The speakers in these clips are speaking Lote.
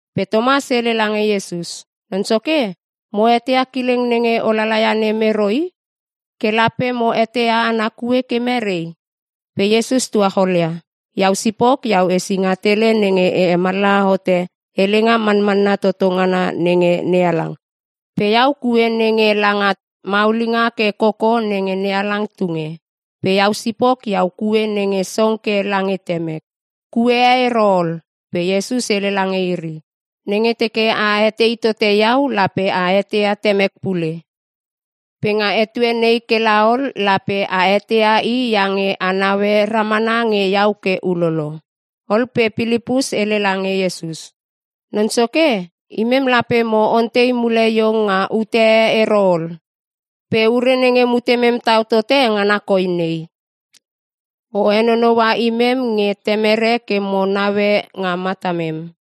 Pe Tomas hele lange Iesus, “Non Soke mo eteia kileng nenge o lala ia nem ero i. Ke lape mo eteia ana kue ke merei?” Pe Iesus tuacholia, “Iau sipok iau esinga tele nenge e hemallaha hote helenga manmanna toto ngana nenge NeHalang, pe iau kue nenge langa maulinga ke koko nenge NeHalang tunge. Pe iau sipok iau kue nenge song ke lange Temek. Kue e ero ol.” Pe Iesus hele lange iri, “Nenge teke a etei tote iau lape a eteia Temek pule. Pe nga etue nei kela ol lape a eteia i iange a naue ramana nge iau ke ulolo.” Ol pe Pilipus hele lange Iesus, “Non Soke, imem lape mo ontei mule iong nga ute e ero ol. Pe ure nenge mutemem tau tote ngana koi nei; O henonoua imem nge Temere ke mo naue nga matamem.”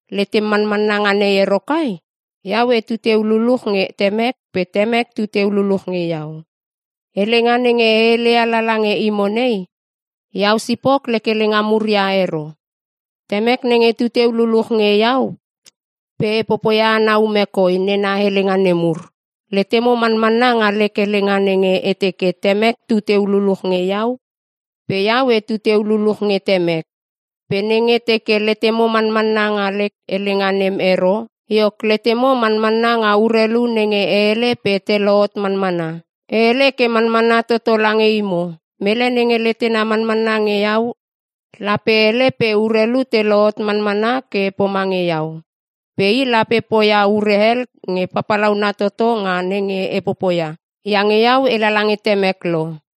Letem manmanna nga nei ero kai? Iau etu teu luluch nge Temek pe Temek tu teu luluch nge iau. Helenga nenge e heleia lala nge imo nei, iau sipok lek helenga mur ia ero. Temek nenge tu teu luluch nge iau pe e popoia ana ume koi nena helenga nemur. Letemo manmanna nga lek helenga nenge e teke Temek tu teu luluch nge iau pe iau etu teu luluch nge Temek. Pe nenge teke letemo manmanna nga lek helenga nem ero, iok letemo manmanna nga urelu nenge e hele pe te lohot manmana. E hele ke manmanna toto lange imo. Mele nenge letena manmanna nge iau, lape hele pe urelu te lohot manmana ke pomange iau. Pe i lape poia ure hel nge papalauna toto nga nenge e popoia, iange iau e lala nge Temek lo.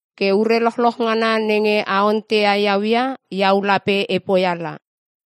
Ke ure lochloch nenge a ontei iau ia, iau lape e poia la.”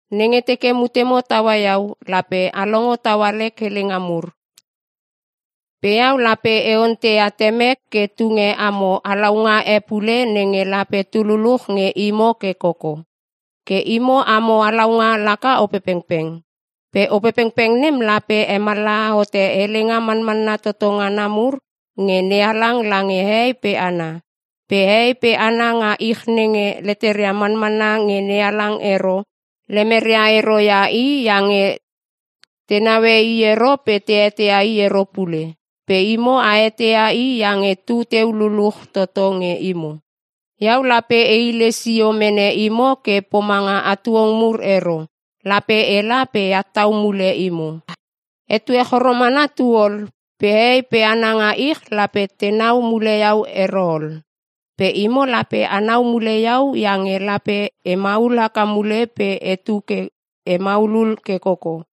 Nenge teke mutemo taua iau, lape a longo taua lek helenga mur. Pe iau lape e onteia Temek ke tunge amo halaunga e pule nenge lape tu luluch nge imo ke koko. Ke imo amo halaunga laka Opepengpeng. Pe Opepengpeng nem lape hemallaha hote helenga manmanna toto ngana mur nge NeHalang lange hehei pe hana. Pe hehei pe hana nga ich nenge leteria manamanna nge NeHalang ero, lemeria ero ia i iange te naue i ero pe te eteia i ero pule. Pe imo a eteia i iange tu teu luluch toto nge imo. Iau lape e hile sio mene imo ke pomanga hatuong mur ero. Lape ela pe eat tau mule imo. Etue choro mana tu ol pe hehei pe hana nga ich lape tenau mule iau ero ol. Pe imo lape anau mule iau iange lape e maul haka mule pe etu ke e maulul ke koko.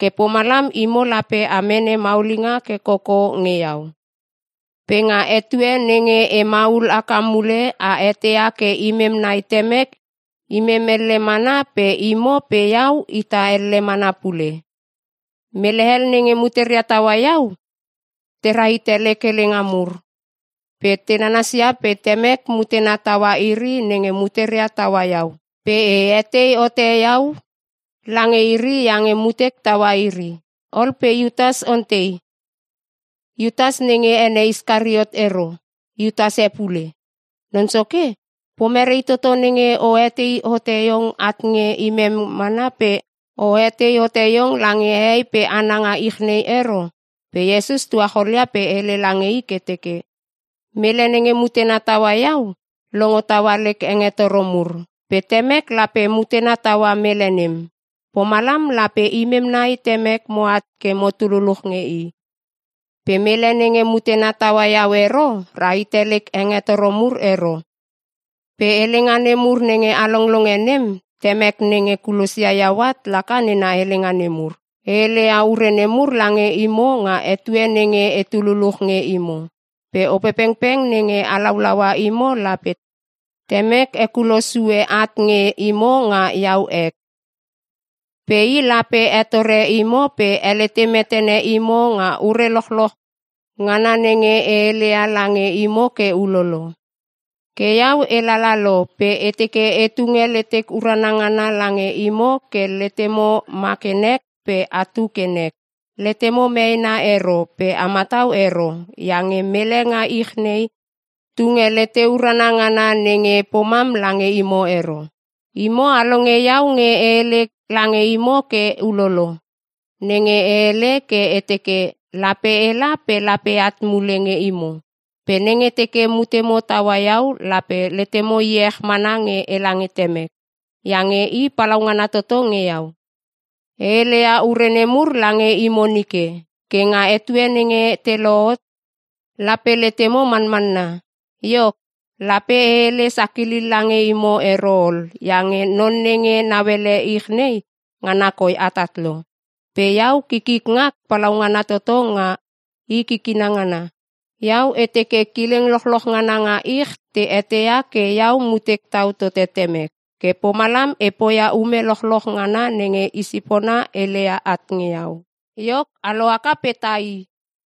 Ke pomalam imo lape a mene maulinga ke koko nge iau. Pe nga etue nenge e maul haka mule a eteia ke imem nai Temek imem elle mana pe imo pe iau ita elle mana pule. Mele hel nenge muteria taua iau tera hite lek helenga mur pe te nanasia pe Temek mutena taua iri nenge muteria taua iau. Pe e hetei hote iau lange iri iange mutek taua iri. Ol pe Iutas ontei, (Iutas nenge ene Iskariot ero, Iutas e pule) “Non Soke pomerei toto nenge o hetei hote iong at nge imem mana pe o hetei hote iong lange hehei pe hana nga ich nei ero?” Pe Iesus tuacholia pe hele lange i ke teke, “Mele nenge mutena taua iau, longo taua lek hengetoro mur pe Temek lape mutena taua mele nem. Pomalam lape imem nai Temek moat ke motu luluch nge i. Pe mele nenge mutena taua iau ero rahite lek hengetoro mur ero. Pe helenga nemur nenge a longlonge nem Temek nenge kulosia iau at laka nena helenga nemur. “E heleia ure nemur lange imo nga etue nenge etu luluch nge imo. Pe Opepengpeng nenge halaulaua imo lape Temek hekulo sue at nge imo nga iau ek. Pe i lape hetore imo pe helete metene imo nga ure lochloch ngana nenge e heleia lange imo ke ulolo. Ke iau e lala lo pe e teke e tunge letek urana ngana lange imo ke letemo ma ke nek pe atu ke nek. Letemo meena ero pe a matau ero iange mele nga ich nei tunge lete urana ngana nenge pomam lange imo ero. “Imo a longe iau nge e hele lange imo ke ulolo nenge e hele ke e teke, ‘Lape ela pe lape eat mule nge imo.’ Pe nenge teke mutemo taua iau lape letemo iech mana nge ela nge Temek iange i palaungana toto nge iau. E heleia ure nemur lange imo nike ke nga etue nenge te lohot, lape letemo manmanna. Iok, lape e hele sakilil lange imo ero ol iange non nenge nauele ich nei ngana koi atat lo. Pe iau kikik ngak palaungana toto nga i kikina ngana. Iau e teke kileng lochloch ngana nga ich te eteia ke iau mutek tau tote Temek. Ke pomalam e poia ume lochloch ngana nenge i sipona heleia at nge iau. “Iok a lohaka pe tai!”